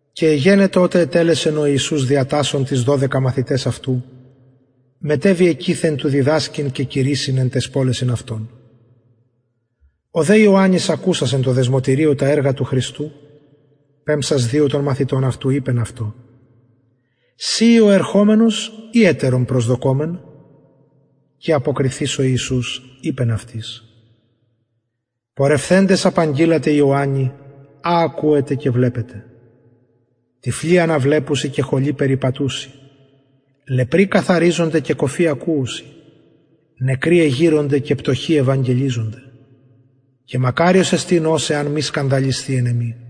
και εγενετο οτε ετελεσεν ο ιησους διατασσων τοις δωδεκα μαθηταις αυτου μετεβη εκειθεν του διδασκειν και κηρυσσειν εν ταις πολεσιν αυτων ο δε ιωαννης ακουσας εν τω δεσμωτηριω τα εργα του χριστου πεμψας δυο των μαθητων αυτου ειπεν αυτω συ ει ο ερχομενος η ετερον προσδοκωμεν και αποκριθεις ο ιησους ειπεν αυτοις πορευθεντες απαγγειλατε ιωαννη α ακουετε και βλεπετε τυφλοι αναβλεπουσιν και χωλοι περιπατουσιν λεπροι καθαριζονται και κωφοι ακουουσιν νεκροι εγειρονται και πτωχοι ευαγγελιζονται και μακαριος εστιν ος εαν μη σκανδαλισθη εν εμοι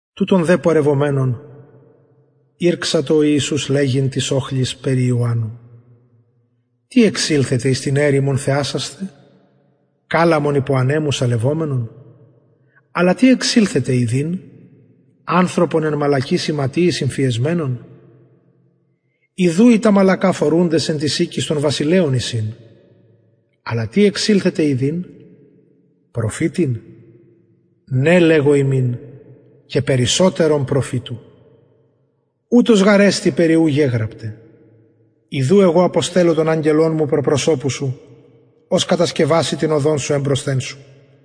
τουτων δε πορευομενων ηρξατο ο ιησους λεγειν τοις οχλοις περι ιωαννου τι εξηλθετε εις την ερημον θεασασθαι καλαμον υπο ανεμου σαλευομενον αλλα τι εξηλθετε ιδειν ανθρωπον εν μαλακοις ιματιοις ημφιεσμενον ιδου οι τα μαλακα φορουντες εν τοις οικοις των βασιλειων εισιν αλλα τι εξηλθετε ιδειν προφητην ναι λεγω υμιν και περισσοτερον προφητου ουτος γαρ εστιν περι ου γεγραπται ιδου εγω αποστελλω τον αγγελον μου προ προσωπου σου ος κατασκευασει την οδον σου εμπροσθεν σου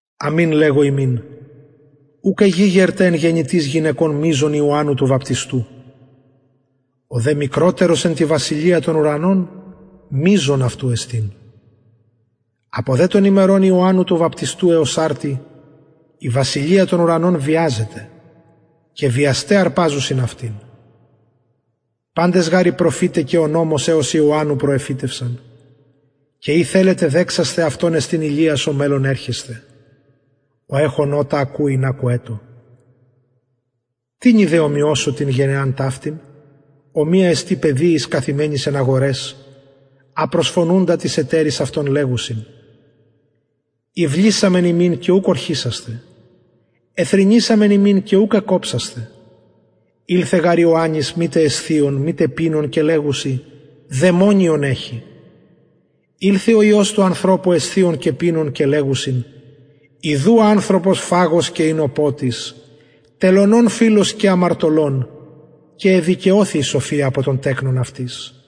αμην λεγω υμιν ουκ εγηγερται εν γεννητοις γυναικων μειζων ιωαννου του βαπτιστου ο δε μικροτερος εν τη βασιλεια των ουρανων μειζων αυτου εστιν απο δε των ημερων ιωαννου του βαπτιστου εως αρτι η βασιλεια των ουρανων βιαζεται και βιασται αρπαζουσιν αυτην παντες γαρ οι προφηται και ο νομος εως ιωαννου προεφητευσαν και ει θελετε δεξασθαι αυτος εστιν ηλιας ο μελλων ερχεσθαι ο εχων ωτα ακουειν ακουετω τινι δε ομοιωσω την γενεαν ταυτην ομοια εστιν παιδιοις εν αγοραις καθημενοις και προσφωνουσιν τοις εταιροις αυτων και λεγουσιν ηυλησαμεν υμιν και ουκ ωρχησασθε εθρηνησαμεν υμιν και ουκ εκοψασθε ηλθεν γαρ ιωαννης μητε εσθιων μητε πινων και λεγουσιν δαιμονιον εχει ηλθεν ο υιος του ανθρωπου εσθιων και πινων και λεγουσιν ιδου ανθρωπος φαγος και οινοποτης τελωνων φιλος και αμαρτωλων και εδικαιωθη η σοφια απο των τεκνων αυτης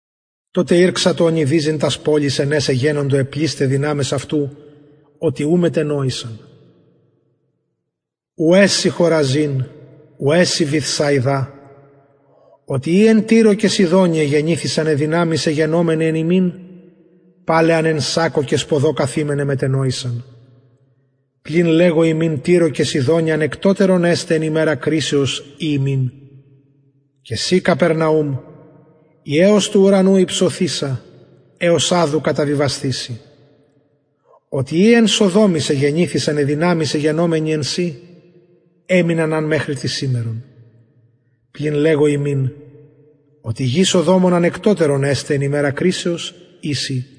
τοτε ηρξατο ονειδιζειν τας πολεις εν αις εγενοντο αι πλεισται δυναμεις αυτου οτι ου μετενοησαν ουαι σοι χοραζιν ουαι σοι βηθσαιδα οτι ει εν τυρω και σιδωνι εγενοντο αι δυναμεις αι γενομεναι εν υμιν παλαι αν εν σακκω και σποδω μετενοησαν πλην λεγω υμιν τυρω και σιδωνι ανεκτοτερον εσται εν ημερα κρισεως η υμιν και συ καπερναουμ η εως του ουρανου υψωθεισα εως αδου καταβιβασθηση οτι ει εν σοδομοις εγενοντο αι δυναμεις αι γενομεναι εν σοι εμειναν αν μεχρι της σημερον πλην λεγω υμιν οτι γη σοδομων ανεκτοτερον εσται εν ημερα κρισεως η σοι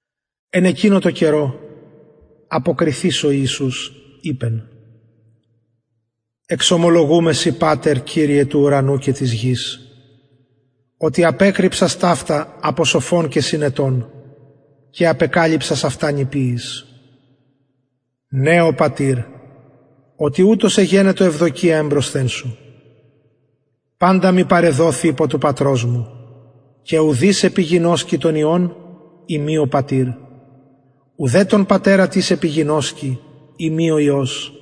εν εκεινω τω καιρω αποκριθεις ο ιησους ειπεν εξομολογουμαι σοι πατερ κυριε του ουρανου και της γης οτι απεκρυψας ταυτα απο σοφων και συνετων και απεκαλυψας αυτα νηπιοις ναι ο πατηρ οτι ουτως εγενετο ευδοκια εμπροσθεν σου παντα μοι παρεδοθη υπο του πατρος μου και ουδεις επιγινωσκει τον υιον ει μη ο πατηρ ουδε τον πατερα τις επιγινωσκει ει μη ο υιος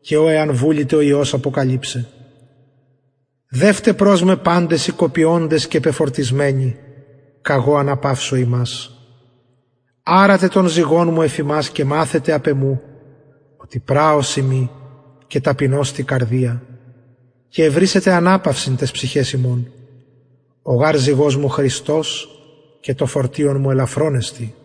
και ω εαν βουληται ο υιος αποκαλυψαι δευτε προς με παντες οι κοπιωντες και πεφορτισμενοι καγω αναπαυσω υμας αρατε τον ζυγον μου εφ υμας και μαθετε απ εμου οτι πραος ειμι και ταπεινος τη καρδια και ευρησετε αναπαυσιν ταις ψυχαις υμων ο γαρ ζυγος μου χρηστος και το φορτιον μου ελαφρον εστιν